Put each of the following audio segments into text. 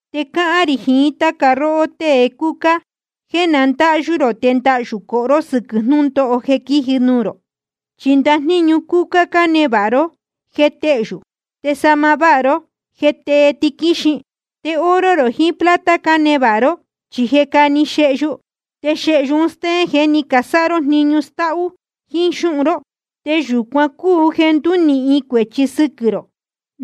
Te cáhán rī jiín táca róhó tée cúcá, jéē na ndáhyú rō te ndahyū cohó ró sɨquɨ̄ jnūndóho jeē quíji nuū rō. Chi ndajníñu cúcá cánevāha ró, je téhyú. Te sahma váha ró, je tée tiquíxin. Te oro jiín plata cánevāha ró, chi je cáne xehyu. Te xehyu un stéén jeē ní casáha ró jniñu stáhú jíín xúhun ró. Te yūcuan cúu jeē ndúnīhin cuēchi sɨquɨ̄ rō,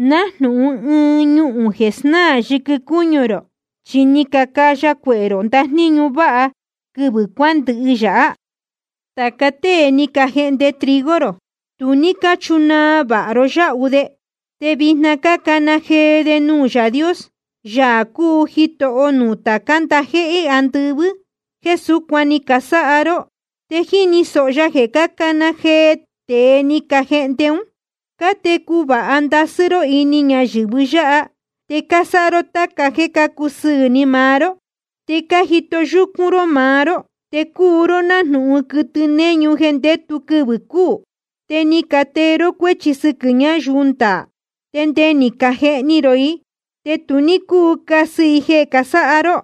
nájnūhun ɨɨn ñuhūn jeē snáā yɨquɨ cúñu rō. Chi ni cacaya cuehē rō ndajníñu váha quɨvɨ̄ cuándɨhɨ yáha. Te tāca tée ni cajehnde trigo rō, tu ní cáchunaa vāha ró yáhu de. Te vijna cácana jee de nuū Yaā Dios, Yaā cúu Jitoho nuū tācá ndajéhé andɨvɨ́, jeē súcuan ni casáha ró. Te jíni sōho ya jeē cácana jee tēe ni cajehnde ún. Cátecu vāha ndasɨ́ ró ini ñayɨ̄vɨ yáha, te cásáha ró táca jéē cácusɨɨ̄ ni maá ró. Te cájito yúcún ró maá ró, te cúu ró nájnūhun quɨtɨ néñu jeē ndétu quɨvɨ̄ cúū. Te ni catee ró cuéchi sɨquɨ̄ ñáyuu ndaā, te nde ni cajehni rō i. Te tu ní cúu casɨ i jeē casáha ró.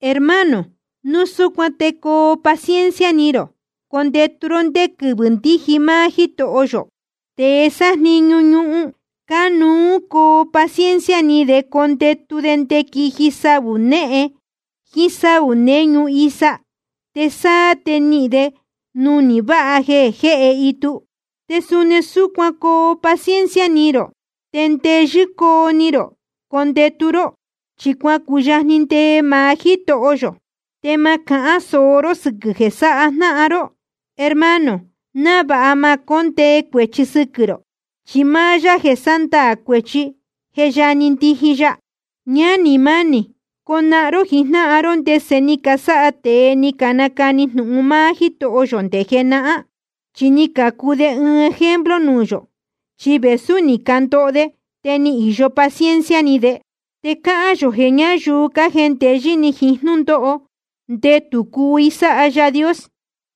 Hermano, núu súcuan te coo paciencia ni rō condetu ró ndé quɨvɨ̄ ndíji máá Jítoho yō. Tēe sájniñu ñuhun, cánuú coo paciencia ni de condetu de nde quiji saū néhen jiín sáū néñu isa, te sáá te nihīn de nunī váha jeē jéhe itu. Te suni súcuan coo paciencia ni rō, te ndeyɨ́ coo ni rō condetu ró, chi cuacuyajni ndee maá Jítoho yō. Te ma cahán sōo ró sɨquɨ̄ jeē sáha jnáhan ró, hermano, návāha ma jécondee cuēchi sɨquɨ̄ rō. Chi máá Yaā jeē sándaā cuēchi, je yajni ndiji ya. Ñánī mánī, conahan ró jijnáhan ró ndese ni casáha tēe ni canacani jnūhun máá Jítoho yō nde jenahán, chi ni cacuu de ɨɨn ejemplo nuū yō. Chi vēsú ni candoho de, te ni īyo paciencia ni de. Te cáhán yō jeē ñáyuu cájendeyɨ́ ni jiín jnúndóho, ndetū cúu i sáha Yaā Dios.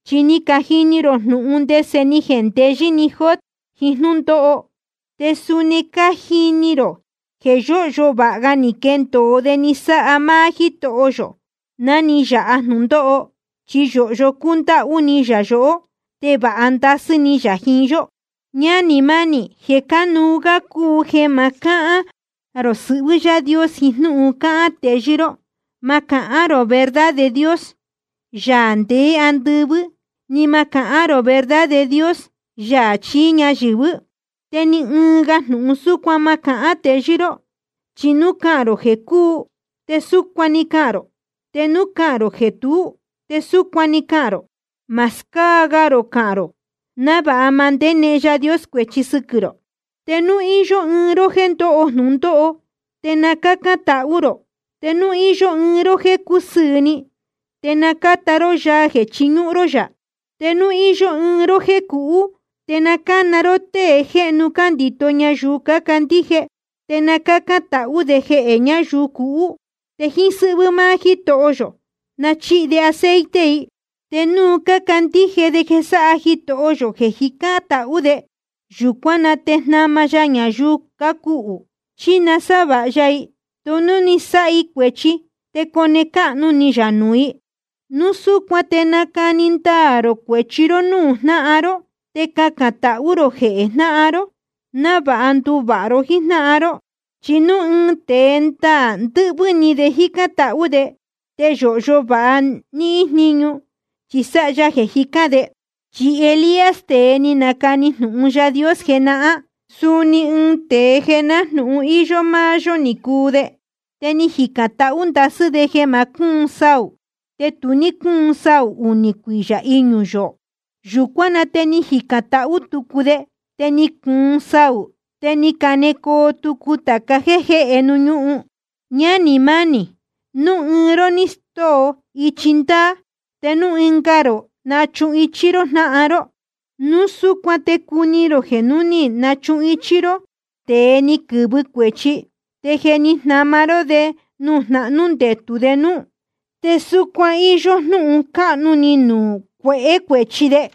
Chi ni cajini ró jnúhun ndese ni jendeyɨ́ ni Job jiín jnúndóho, te suni cájini rō jeē yóhyo vāha ga ni quendōo de ni sáha máá Jítoho yō ná ni yāha jnūndóho. Chi yōhyo cúndáhú ni yā yohó, te vāha ndasɨ́ ni yā jiín yó. Ñánī mánī, jeē cánuú gá cúu jeē ma cahán cāha ró sɨhvɨ́ Yaā Dios jiín jnúhun cácahān teyɨ́ ró. Ma cahán rō verdad de Dios, Yaā ndeé andɨvɨ́, ni ma cahán rō verdad de Dios, Yaā chií ñayɨ̄vɨ́, te ni ɨɨn ga jnūhun súcuan ma cahán teyɨ́ ró. Chi núu cahān rō jeē cuu, te súcuan‑ni cahān rō. Te núu cahān rō jeē tuú, te súcuan‑ni cahān rō, ma scáa gā rō cahān rō, návāha ma ndénehen Yaā Dios cuēchi sɨquɨ̄ rō. Te núu íyó ɨɨn ró jéē ndóho jnūndóho, te na cácán tahú rō. Te núu íyó ɨɨn ró jéē cúsɨɨ̄ ni, te na cáta ró yaa jeē chiñúhún ró yá. Te núu íyó ɨɨn ró jéē cuhú, te na cána ró tée jéhnu cándito ñayuu cácandíje. Te na cácán tahú de jehē ñayuu cuhú. Te jíín sɨ́hvɨ́ máá Jítoho yō na chíhi de aceite i. Te núu cácandíje de jeē sáha Jitoho yō jeē cájicān tahú de, yūcuán na te jnama ya ñayuu cuhú. Chi nasávāha ya i, te núu ni sáha i cuēchi, te cone cáhnu ni yā nuū i. Núu súcuan te nacani ndaā rō cuēchi ró núū jnáhan ró, te cacān tahú rō jehē jnáhan ró návāha nduvāha ró jíjnáhan ró. Chi núu ɨɨn tēe ndaā ndɨ́hvɨ́ ni de jícán tahú de, te yōhyo vāha níhín jníñu, chi sáha ya jeē jicán de. Chi Elías, tēe ni nacani jnūhun Yaā Dios jenahán, suni ɨɨn tēe jeē nájnūhun íyó máá yó ni cuu de. Te ni jicān tahú ndasɨ́ de jeē ma cúun saū, te tu ní cúun saū unī cuiyā iñū yoō. Yūcuán na te ni jicān tahú tucu de, te ni cuun saū, te ni canecoo tucu tāca jéē jéhe ñuhun. Ñánī mánī, núu ɨɨn ró ni stóo ichi ndaā, te núu ɨnga rō nachuhichí ró jnáhan ró, núu súcuan te cuni rō jeē núu ni nachuhichí ró tēe ni quɨ̄vɨ cuēchi, te je ni jnama ró de jeē jnahnú ndetū de núú, te súcuan íyó jnúhun cáhnu ni nuū cuehē cuēchi de.